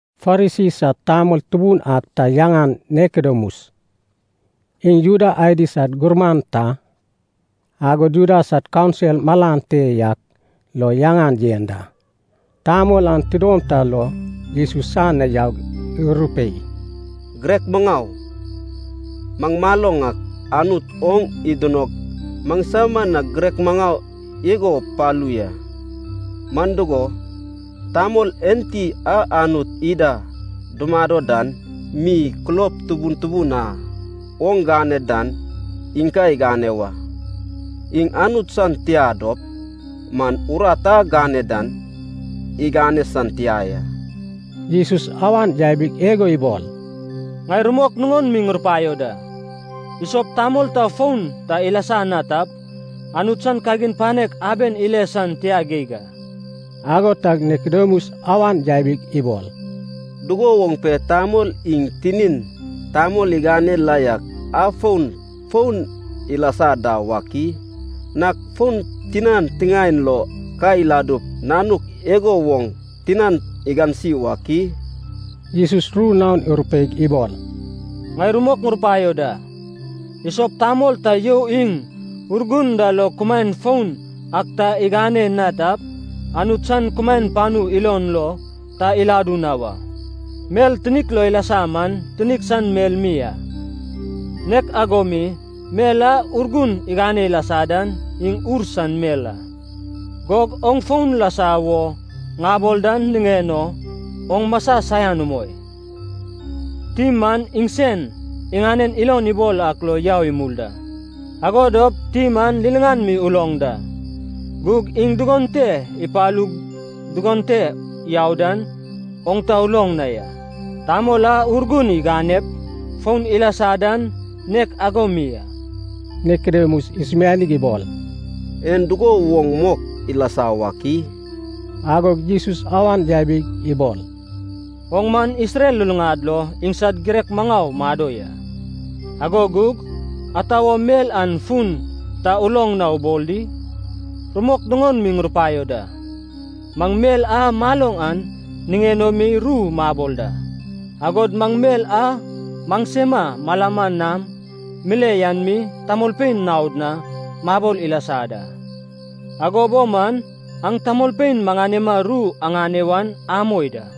Farisi sad tamol tubun ak ta yaŋan Nikodemus. Iŋ Juda adi sad gurman ta, agod Juda sad kaunsil malan te yak lo yaŋan yen da. Tamol an tidom ta lo Jesus san na yaug, irupei, “Girek Maŋau, maŋ maloŋ ak Anut oŋ idinog maŋsama na girek maŋau igo palu ya. Man dugo, tamol enti a Anut ida dumado dan mi, kulob tubun tubun a oŋ gane dan iŋ ka igane wa. Iŋ Anut san tia dop man, urat a gane dan igane san tia ya.” Jesus awan yabig igo ibol, “Ŋai rumok nuŋon mi ŋurupaio da. Isop tamol ta foun ta ilasa na tap, Anut san kagin panek aben ile san tia geig a.” Ago tag Nikodemus awan yabig ibol, “Dugo woŋ pe tamol iŋ tinin tamol igane la yak afon foun ilasa da wak i? Nag fon tinan tiŋaen lo ka iladup, nanuk igo woŋ tinan igansi wak i?” Jesus ru naon irupeig ibol, “Ŋai rumok ŋurupaio da. Isop tamol ta you iŋ Urgun da lo kumaen foun ak ta iŋane na tap, Anut san kumaen panu ilon lo ta iladu na wa. Mel tinik lo ilasa man tinik san mel mi a, nek ago mi, mel a Urgun igane ilasa dan iŋ ur san mel a. Gug oŋ foun lasa wo ŋabol dan niŋen o oŋ masa saian umoi. Tim man iŋsen iŋanen ilon ibol ak lo yau imul da. Ago dop tim an liliŋan mi uloŋ da. Gug iŋ dugon te ipalug dugon te yau dan, oŋ ta uloŋ na ya. Tamol a Urgun iganep, foun ilasa dan nek ago mi a.” Nikodemus isumianig ibol, “En dugo woŋ mok ilasa wak i?” Agog Jesus awan yabig ibol, “Oŋ man Isrel luluŋad lo iŋsad girek maŋau mado ya, ago gug, ata wo mel an fun ta uloŋ na ubol di? Rumok nuŋon mi ŋurupaio da. Maŋ mel a maloŋ an niŋen o mi ru mabol da, agod maŋ mel a maŋsema malama nam mile yan mi tamolpein naod na mabol ilasa da, ago bo man aŋ tamolpein maŋanema ru aŋane wan amoi da.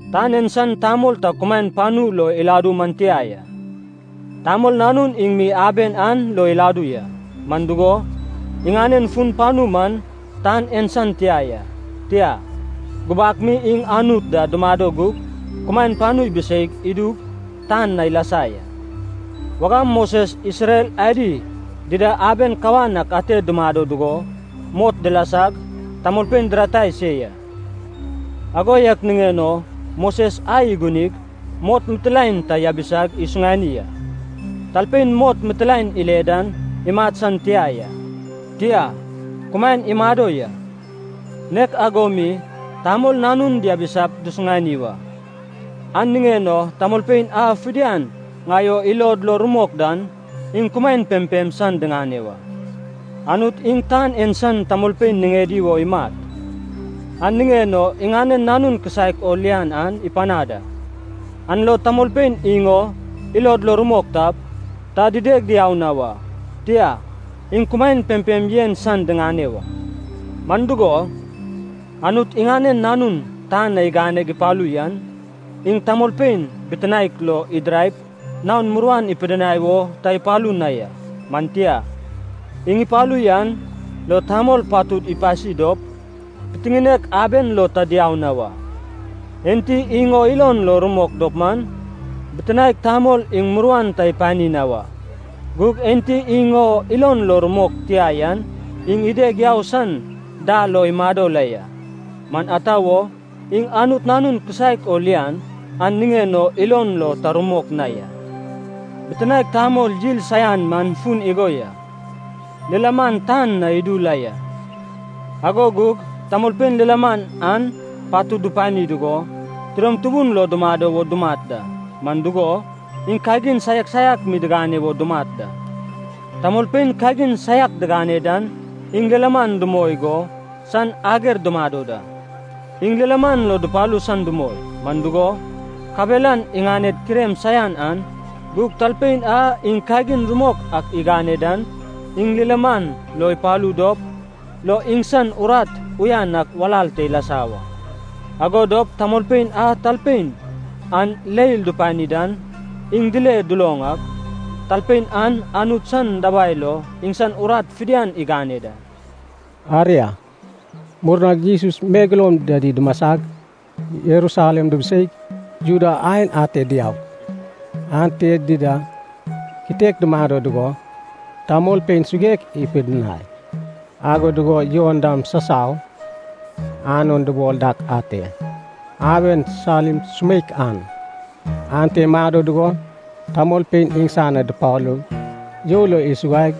Tan en san tamol ta kumaen panu lo iladu man tia ya. Tamol Nanun iŋ mi aben an lo iladu ya. Man dugo, iŋanen fun panu man tan en san tia ya, tia, gubak mi iŋ Anut da dumado gug, kumaen panu ibiseig idug tan na ilasa ya. Wagam Moses Isrel adi dida aben kawan ak ate dumado dugo mot dilasag, tamolpein diratai se ya. Ago yak niŋen o Moses ai igunig, mot mitilaen ta yabisag isuŋani a. Talpein mot mitilaen ile dan, imat san tia ya, tia, kumaen imado ya. Nek ago mi Tamol Nanun diabisap dusuŋani wa. An niŋen o tamolpein a fidian ŋai o ilod lo rumok dan, iŋ kumaen pempem san diŋane wa. “Anut iŋ tan en san tamolpein niŋedi wo imat, an niŋen o iŋanen Nanun kisaek o lian an ipanad a. An lo tamolpein iŋ o ilod lo rumok tap, ta dideg diau na wa. Tia, iŋ kumaen pempem yen san diŋane wa. Man dugo, Anut iŋanen Nanun tan na iganeg ipalu yan, iŋ tamolpein bitinaek lo idiraip naon muruan ipidinai wo ta ipalu na ya. Man tia. Iŋ ipalu yan lo tamolpein patud ipasi dop, pitiŋinek aben lo ta diau na wa. Enti iŋ o ilon lo rumok dop man, Bitinaek Tamol iŋ muruan ta ipani na wa. Gug enti iŋ o ilon lo rumok tia yan iŋ ideg yau san dal lo imado la ya. Man ata wo, iŋ Anut Nanun kisaek o lian an niŋen o ilon lo ta rumok na ya. Bitinaek Tamol yil saian man fun igo ya. Lilaman tan na idu la ya, ago gug tamolpein lilaman an patud dupani dugo, tidom tubun lo dumado wo dumat da. Man dugo, iŋ kagin saiak saiak mi digane wo dumat da. Tamolpein kagin saiak digane dan iŋ lilaman dumoi go san ager dumado da. Iŋ lilaman lo dupalu san dumoi, man dugo, kabelan iŋaned kirem saian an kuai te ilasa banau. Gug talpein a iŋ kagin rumok ak igane dan iŋ lilaman lo ipalu dop lo iŋsan urat uyan ak walal te ilasa wa. Ago dop tamolpein a talpein an leil dupani dan, iŋ dile duloŋ ak, talpein an Anut san dabai lo iŋsan urat fidian igane da.” Aria, murnag Jesus megeloum dida dumasag, Jerusalem dubuseig, Judea aen ate diaug, ante dida kitek dumado dugo tamolpein suguek ipidinai. Ago dugo Jon dam sasau Ainon dubol dak ate, aben Salim sumeik an, ante imado dugo tamolpein iŋsan na dupalug you lo isuguai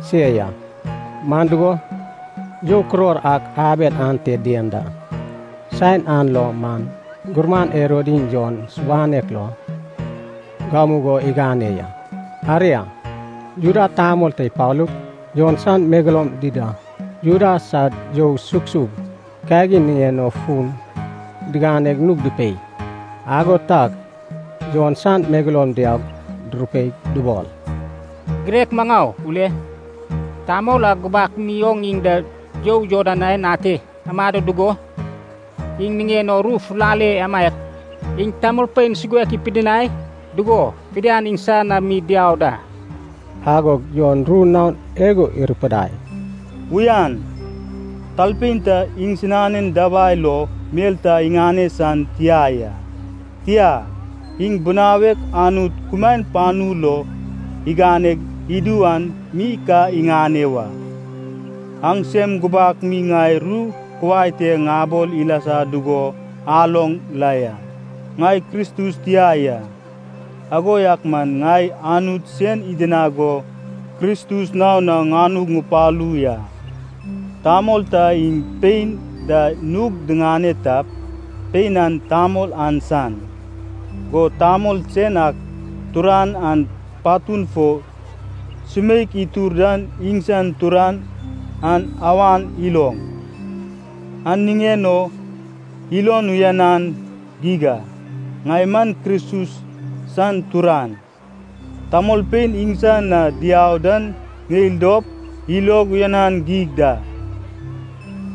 se ya. Man dugo, you kuror ak aben ante dien da. Saen an lo man gurman Herod iŋ Jon subanek lo gamugo igane ya. Aria, Juda tamol ta ipalug, Jon san megeloum dida Juda sad you sugsug kagin niŋen o fun diganeg nug dupei. Ago tag Jon san megeloum diaug durupeig dubol, “Girek maŋau ule, tamol a gubak mi oŋ iŋ da you Jordan aen ate amado dugo, iŋ niŋen o ru fulale amaiak, iŋ tamolpein suguek ipidinai dugo fidian iŋsan na mi diau da.” Agog Jon ru naon igo irupidai, “Uyan, talpein ta iŋsinan dabai lo mel ta iŋane san tia ya. Tia, iŋ binawek Anut kumaen panu lo iganeg idu an mi ka iŋane wa. Aŋsem gubak mi ŋai ru kuai te ŋabol ilasa dugo aloŋ la ya. Ŋai Kristus tia ya. Ago yak man ŋai Anut sen idinag go Kristus naon na ŋanug ŋupalu ya. Tamol ta iŋ pein da nug diŋane tap, pein an tamol an san. Go tamol sen ak turan an patun fo sumeik itur dan iŋsan turan an awan iloŋ, an niŋen o ilon uyanan geig a. Ŋai man Kristus san turan, tamolpein iŋsan na diau dan ŋeil dop, ilog uyanan geig da.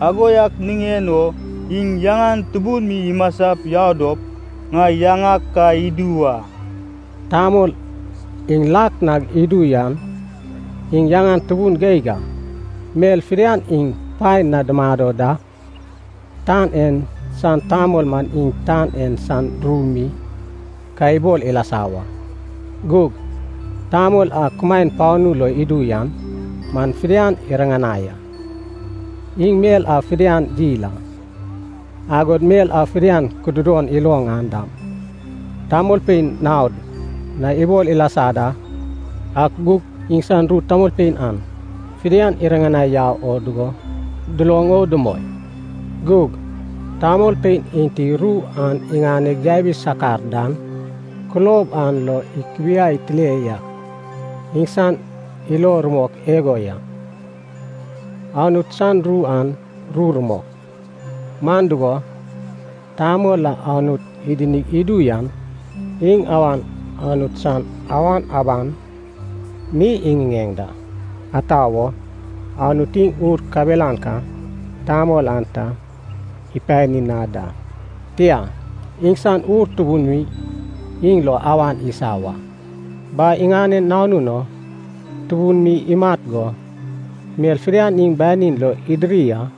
Ago yak niŋen o iŋ yaŋan tubun mi imasap yau dop, ŋai yaŋag ka idu wa.” Tamol iŋ lak nag idu yan iŋ yaŋan tubun geig a, mel fidian iŋ paen na dumado da. Tan en san tamol man iŋ tan en san ru mi ka ibol ilasa wa. Gug tamol a kumaen panu log idu yan man fidian iriŋanai a. Iŋ mel a fidian yil an, agod mel a fidian kududon iloŋ an dam, tamolpein naod na ibol ilasa da. Ak gug iŋsan ru tamolpein an fidian iriŋanai yau oŋ dugo, duloŋ o dumoi. Gug talpein enti ru an iŋaneg yabi sakar dan, kulob an lo ikubiai tile yak iŋsan ilo rumok igo ya, “Anut san ru an ru rumok.” Man dugo, Tamol a Anut idinig idu yan, iŋ awan Anut san awan aban mi iŋiŋeŋ da. Ata wo? Anut iŋ Ur kabelan ka Tamol an ta ipani na da, tia, iŋsan Ur tubun mi iŋ lo awan isa wa. Bai iŋanen Nanun o tubun mi imat go, mel fidian iŋ banin lo idiri a.